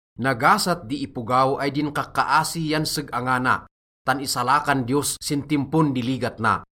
Nagasat di ipogaw ay din kakkaasi yan seg-angana, tan isalakan Diyos sin timpon di ligat na.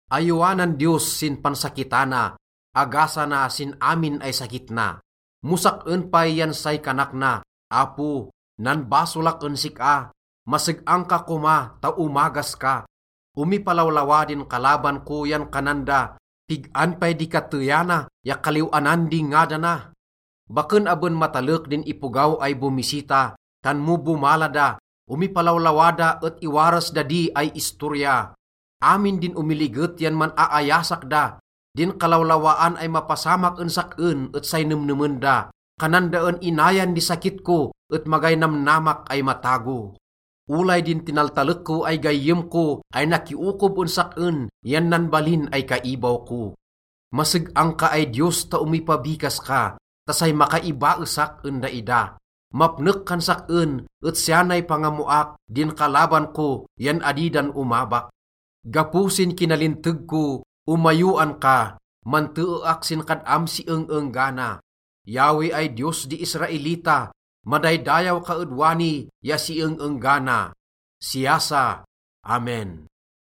Ayowanan Diyos sin pansakitana, agasana sin amin ay sakit na. Mo sak-en pay yan say kanak na, “Apo, nanbasolak en sik-a, maseg-ang ka koma ta omagas ka.” Omipalawlawa din kalaban ko yan kanan da, “Pig-an pay di kateyana ya kaliw-anan di ngadana?” Baken aben matalek din ipogaw ay bomisita, tan mo bomala da, omipalawlawa da et iwaras da di ay istorya. Amin din omiliget yan man-aayasak da, Din kalawlawaan ay mapasamak en sak-en et say nemnemen da. Kanan da en inayan di sakit ko et magay namnamak ay matago. Olay din tinaltalek ko ay gayyem ko ay nakiokob en sak-en yan nanbalin ay kaibaw ko. Maseg-ang ka ay Diyos ta omipabikas ka ta say makaibaesak en daida. Mapnek kan sak-en, et siya nay pangammoak: din kalaban ko yan adi dan omabak. Gapo sin kinalinteg ko, omayowan ka, manteeak sin kad-am si eng-enggana. Yahweh ay Diyos di Israelita, madaydayaw ka ed wani ya si eng-enggana. Siya sa. Amen.